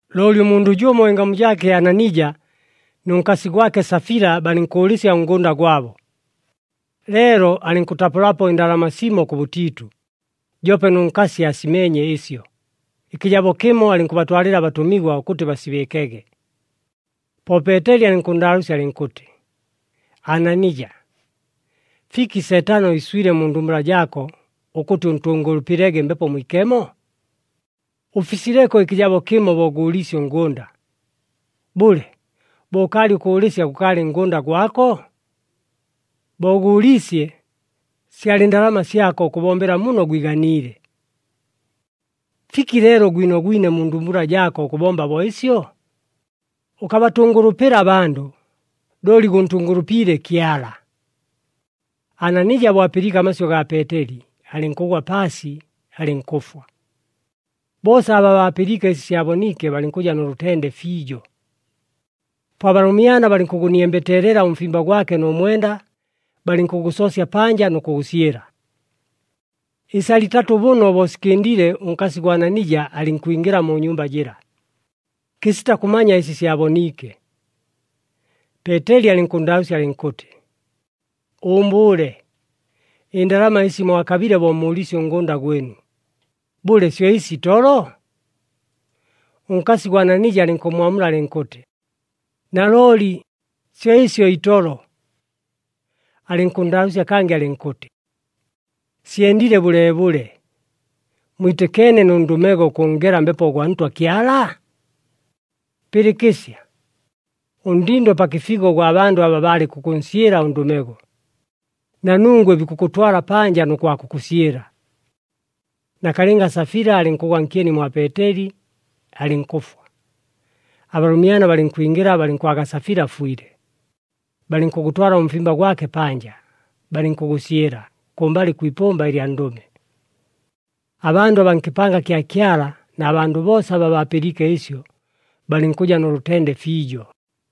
Looli ʉmundʉ jʉmo ɨngamu jaake Ananija nʉ nkasi gwake Safila balɨnkʉʉlɨsya ʉngʉnda gwabo. Leelo alɨnkʉtapʉlapo ɨndalama simo kʉbʉtiitʉ, joope nʉ nkasi aasimeenye ɨsyo, ɨkɨjabo kɨmo alɨnkʉbatwalɨla abatʉmigwa ʉkʉtɨ basibɨɨkege. Po Peeteli alɨnkʉnndaalʉʉsya alɨnkʉtɨ, “Ananija! Fiki Seetano iswile mu ndumbula jaako ʉkʉtɨ ʉntʉngʉlʉpɨlege Mbepo Mwikemo? Ʉfisileko ɨkɨjabo kɨmo bo gʉʉliisye ʉngʉnda. Bʉle, bo ʉkaalɨ ʉkʉʉlɨsya, gʉkaalɨ ngʉnda gwako? Bo gʉʉliisye, syalɨ ndalama syako ʉkʉbombela muno gwiganiile. Fiki leelo gwinogwine mu ndumbula jaako ʉkʉbomba bo ɨsyo? Ʉkabatʉngʉlʉpɨla abandʉ, looli gʉntʉngʉlʉpiile Kyala!” Ananija bo apɨliike amasyʉ gaa Peeteli, alɨnkʉgwa paasi, alɨnkʉfwa. Boosa aba baapɨliike ɨsi syaboniike, balɨnkʉja nʉ lʉtende fiijo. Po abalʉmyana balɨnkʉgʉniembeteelela ʉmfimba gwake nʉ mwenda, balɨnkʉgʉsoosya panja nʉ kʉgʉsyɨla. Ɨsala itatʉ bʉno bo sikɨndile, ʉnkasi ʉgwa Ananija alɨnkwingɨla mu nyumba jɨla, kɨsita kʉmanya ɨsi syaboniike. Peeteli alɨnkʉnndaalʉʉsya alɨnkʉtɨ, “Ʉʉmbʉʉle, ɨndalama ɨsi mwakabile bo mʉʉliisye ʉngʉnda gwɨnu, bʉle syo ɨsi itolo?” Ʉnkasi gwa Ananija alɨnkʉmmwamula alɨnkʉtɨ, “Nalooli, syo ɨsyo itolo!” Alɨnkʉnndaalʉʉsya kangɨ alɨnkʉtɨ, “Syendile bʉleebʉle, mwitɨkeene nʉ ndʉmego ʉkʉnngela Mbepo gwa Ntwa Kyala? Pɨlɨkɨsya, ʉndindo pa kɨfigo ʉgwa bandʉ aba baalɨ kʉkʉnsyɨla ʉndʉmego, na nungwe bikʉkʉtwala panja nʉ kwa kʉkʉsyɨla.” Nakalɨnga Safila alɨnkʉgwa nkyeni mwa Peeteli, alɨnkʉfwa. Abalʉmyana balɨnkwingɨla balɨnkwaga Safila afwile, balɨnkʉgʉtwala ʉmfimba gwake panja, balɨnkʉgʉsyɨla kʉmbalɨ kwi ipʉmba lya ndʉme. Abandʉ abaa nkɨpanga kya Kyala na bandʉ boosa aba baapɨliike ɨsyo, balɨnkʉja nʉ lʉtende fiijo.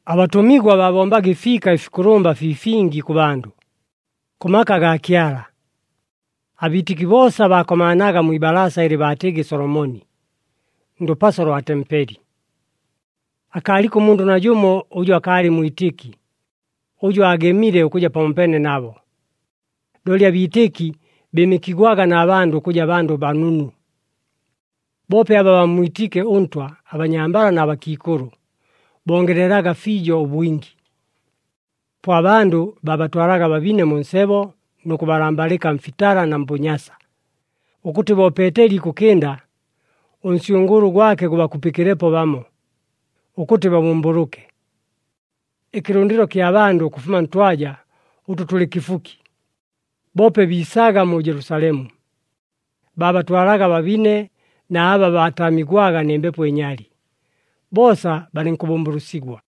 Abatʉmigwa baabombaga ɨfiika ɨfikʉlʉmba fii fingi kʉ bandʉ, kʉ maka agaa Kyala. Abiitɨki boosa baakomaanaga mwi ibalaasa ɨlɨ baatɨgɨ Solomoni, ndʉpaso lwa tempeli. Akaaliko ʉmundʉ najʉmo ʉjʉ akaalɨ mwitɨki, ʉjʉ aagemile ʉkʉja pamopeene nabo, looli abiitɨki bɨɨmɨkigwaga na bandʉ ʉkʉja bandʉ banunu. Boope aba bammwitiike ʉNtwa, abanyambala na bakiikʉlʉ, bongelelaga fiijo ʉbwingi. Po abandʉ baabatwalaga ababine mu nsebo nʉ kʉbalambalɨka mfitala na mbʉnyasa, ʉkʉtɨ bo Peeteli ikʉkɨnda ʉnsyʉngʉʉlʉ gwake gʉbakupɨkɨlepo bamo, ʉkʉtɨ babʉmbʉlʉke. Ɨkɨlʉndɨlo kya bandʉ ʉkʉfuma ntwaja ʉtʉ tʉlɨ kɨfuki, boope biisaga mu Jelusalemu, baabatwalaga ababine na aba baataamigwaga nɨ mbepo ɨnyali, boosa balɨnkʉbʉmbʉlʉsigwa.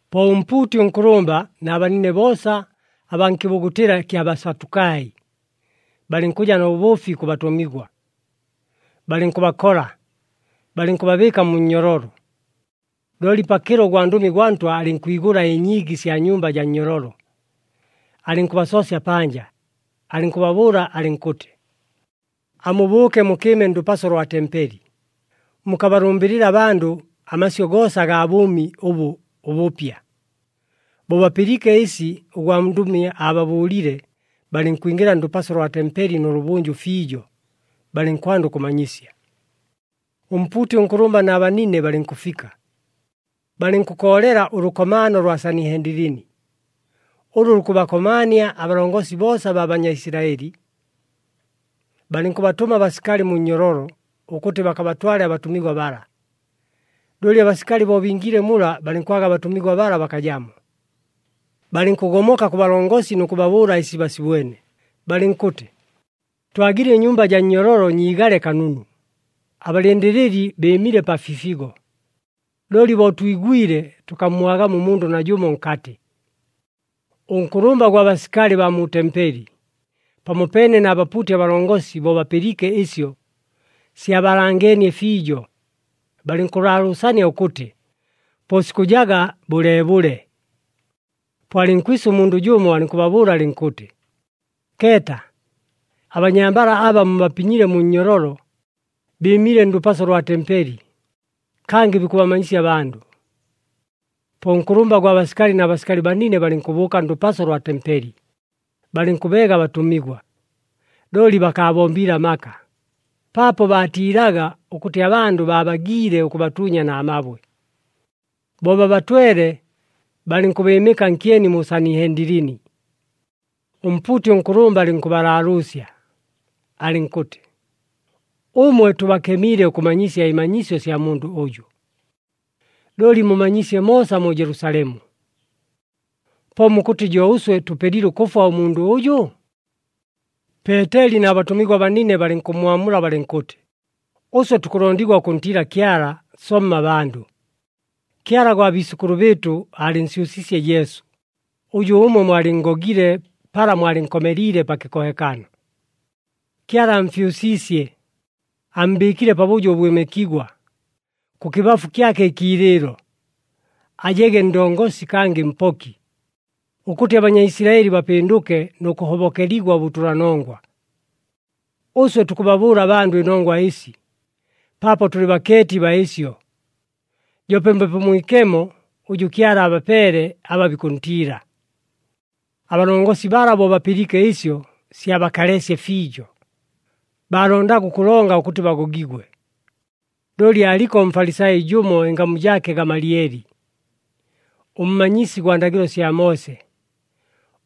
Po ʉmpuuti ʉnkʉlʉmba na banine boosa abaa nkɨbugutɨla kya Basatukai, balɨnkʉja nʉ bʉʉfi kʉ batʉmigwa. Balɨnkʉbakola, balɨnkʉbabɨɨka mu nnyololo. Looli pakɨlo ʉgwandʉmi gwa Ntwa alɨnkwigʉla ɨnyiigi sya nyumba jaa nnyololo, alɨnkʉbasoosya panja, alɨnkʉbabʉʉla alɨnkʉtɨ, “Amubʉʉke mukɨɨme ndʉpaso lwa tempeli, mukabalʉmbɨlɨle abandʉ amasyʉ goosa agaa bʉʉmi ʉbʉ ʉbʉpya.” Bo bapɨliike ɨsi ʉgwandʉmi ababʉʉlile, balɨnkwingɨla ndʉpaso lwa tempeli nʉlʉbʉnjʉ fiijo, balɨnkwanda ʉkʉmanyisya. Ʉmpuuti ʉnkʉlʉmba na banine balɨnkʉfika, balɨnkʉkoolela ʉlʉkomaano lwa Sanihendilini, ʉlʉ lukʉbakomaania abalongosi boosa abaa Banyaisilaɨli. Balɨnkʉbatʉma abasikali mu nnyololo, ʉkʉtɨ bakabatwale abatʉmigwa bala. Looli abasikali bo bingiile mula, balɨnkwaga abatʉmigwa bala bakajamo. Balɨnkʉgomoka kʉ balongosi nʉ kʉbabʉʉla ɨsi basibwene, balɨnkʉtɨ, “Twagile ɨnyumba jaa nnyololo nyiigale kanunu, abalɨndɨlɨli bɨɨmile pa fifigo. Looli bo twigwile, tʉkammwagamo ʉmundʉ najʉmo nkatɨ!” Ʉnkʉlʉmba gwa basikali baa mu tempeli pamopeene na bapuuti abalongosi bo bapɨliike ɨsyo, syabaalangeenie fiijo, balɨnkʉlaalʉʉsania ʉkʉtɨ po sikʉjaga bʉleebʉle. Po alɨnkwisa ʉmundʉ jʉmo, alɨnkʉbabʉʉla alɨnkʉtɨ, “Keeta! Abanyambala aba mubapinyile mu nnyololo, bɨɨmile ndʉpaso lwa tempeli, kangɨ bikʉbamanyisya abandʉ.” Po ʉnkʉlʉmba gwa basikali na basikali banine, balɨnkʉbʉʉka ndʉpaso lwa tempeli, balɨnkʉbeega abatʉmigwa. Looli bakaabombiile amaka, paapo baatiilaga ʉkʉtɨ abandʉ baabagiile ʉkʉbatuunya na mabwe. Bo babatwele, balɨnkʉbɨɨmɨka nkyeni mu Sanihendilini. Ʉmpuuti ʉnkʉlʉmba alɨnkʉbalaalʉʉsya, alɨnkʉtɨ, “Ʉmwe tʉbakemiile ʉkʉmanyisya ɨmanyisyo sya mundʉ ʉjʉ. Looli mumanyiisye moosa mu Jelusalemu. Po mukʉtɨ jo ʉswe tʉpelile ʉkʉfwa ʉmundʉ ʉjʉ?” Peeteli na batʉmigwa banine balɨnkʉmmwamula balɨnkʉtɨ, “Ʉswe tukʉlondigwa ʉkʉntiila Kyala, somma abandʉ! Kyala gwa biisʉkʉlʉ bɨɨtʉ aalɨnsyʉsiisye Jesu, ʉjʉ ʉmwe mwalɨnngogile pala mwalɨnkomeliile pa kɨkohekano. Kyala amfyʉsiisye, ammbɨɨkile pabʉjo ʉbwɨmɨkigwa, kʉkɨbafu kyake ɨkiilɨɨlo, ajege Ndongosi kangɨ Mpoki, ʉkʉtɨ aBanyaisilaɨli bapɨndʉke nʉ kʉhobokeligwa ʉbʉtʉlanongwa. Ʉswe tukʉbabʉʉla abandʉ ɨnongwa ɨsi, paapo tʉlɨ bakeeti baa ɨsyo, joope Mbepo Mwikemo, ʉjʉ Kyala abapeele aba bikʉntiila.” Abalongosi bala bo bapɨliike ɨsyo, syabakaleesye fiijo, baalondaga ʉkʉlonga ʉkʉtɨ bagogigwe. Looli aaliko ʉMfalisai jʉmo, ɨngamu jaake Gamalieli, ʉmmanyisi gwa ndagɨlo sya Moose,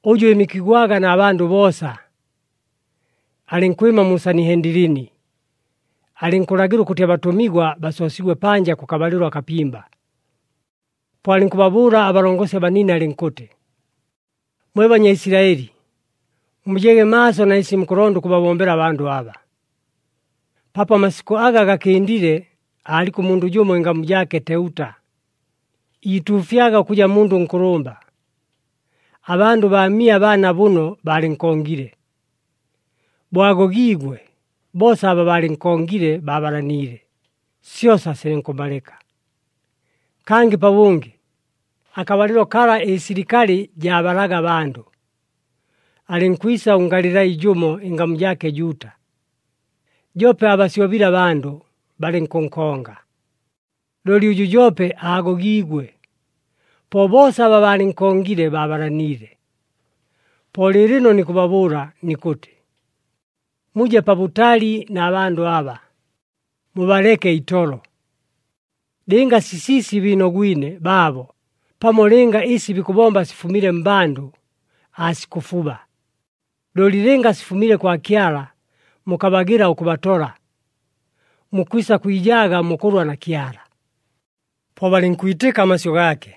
ʉjʉ ɨɨmɨkigwaga na bandʉ boosa. Alɨnkwɨma mu Sanihendilini, alɨnkʉlagɨla ʉkʉtɨ abatʉmigwa basoosigwe panja kʉkabalɨlo akapimba. Po alɨnkʉbabʉʉla abalongosi abanine alɨnkʉtɨ, “Mwe Banyaisilaɨli, mujege maaso na ɨsi mukʉlonda ʉkʉbabombela abandʉ aba. Paapo amasikʉ aga gakɨndile aaliko ʉmundʉ jʉmo ɨngamu jaake Teuta, iituufyaga ʉkʉja mundʉ nkʉlʉmba, abandʉ baamia bana bʉno baalɨnkongile. Bo agogiigwe, boosa aba baalɨnkongile baabalaniile, syosa silɨnkʉmalɨka. Kangɨ pabʉngɨ, akabalɨlo kala ɨsilikali jaabalaga abandʉ, alɨnkwisa ʉNgalilai jʉmo, ɨngamu jaake Juuta, joope aabasyobile abandʉ, balɨnkʉnkonga. Looli ʉjʉ joope aagogiigwe, po boosa aba baalɨnkongile baabalaniile. Po lɨɨlɨno nikʉbabʉʉla nikʉtɨ, muje pabʉtali na bandʉ aba, mubaleke itolo! Lɨnga sisiisi biinogwine baabo pamo lɨnga ɨsi bikʉbomba sifumile mmbandʉ, aasikʉfuba. Looli lɨnga sifumile kwa Kyala, mukabagɨla ʉkʉbatola, mukwisa kwijaaga mukʉlwa na Kyala.” Po balɨnkwitɨka amasyʉ gaake.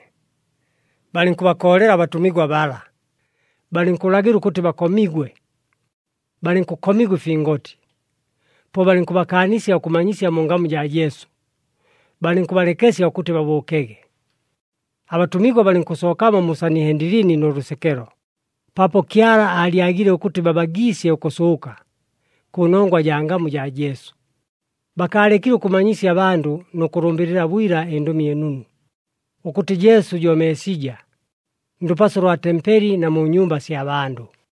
Balɨnkʉbakoolela abatʉmigwa bala, balɨnkʉlagɨla ʉkʉtɨ bakomigwe. Balɨnkʉkomigwa ɨfingoti, po balɨnkʉbakaanisya ʉkʉmanyisya mu ngamu jaa Jesu, balɨnkʉbalekesya ʉkʉtɨ babʉʉkege. Abatʉmigwa balɨnkʉsookamo mu Sanihendilini nʉ lʉsekelo, paapo Kyala aalyagile ʉkʉtɨ baabagiisye ʉkʉsʉʉka, kʉnongwa jaa ngamu jaa Jesu. Bakaalekile ʉkʉmanyisya abandʉ nʉ kʉlʉmbɨlɨla bwila ɨNdʉmi ɨNunu, ʉkʉtɨ Jesu jo Meesija, ndʉpaso lwa tempeli na mu nyumba sya bandʉ.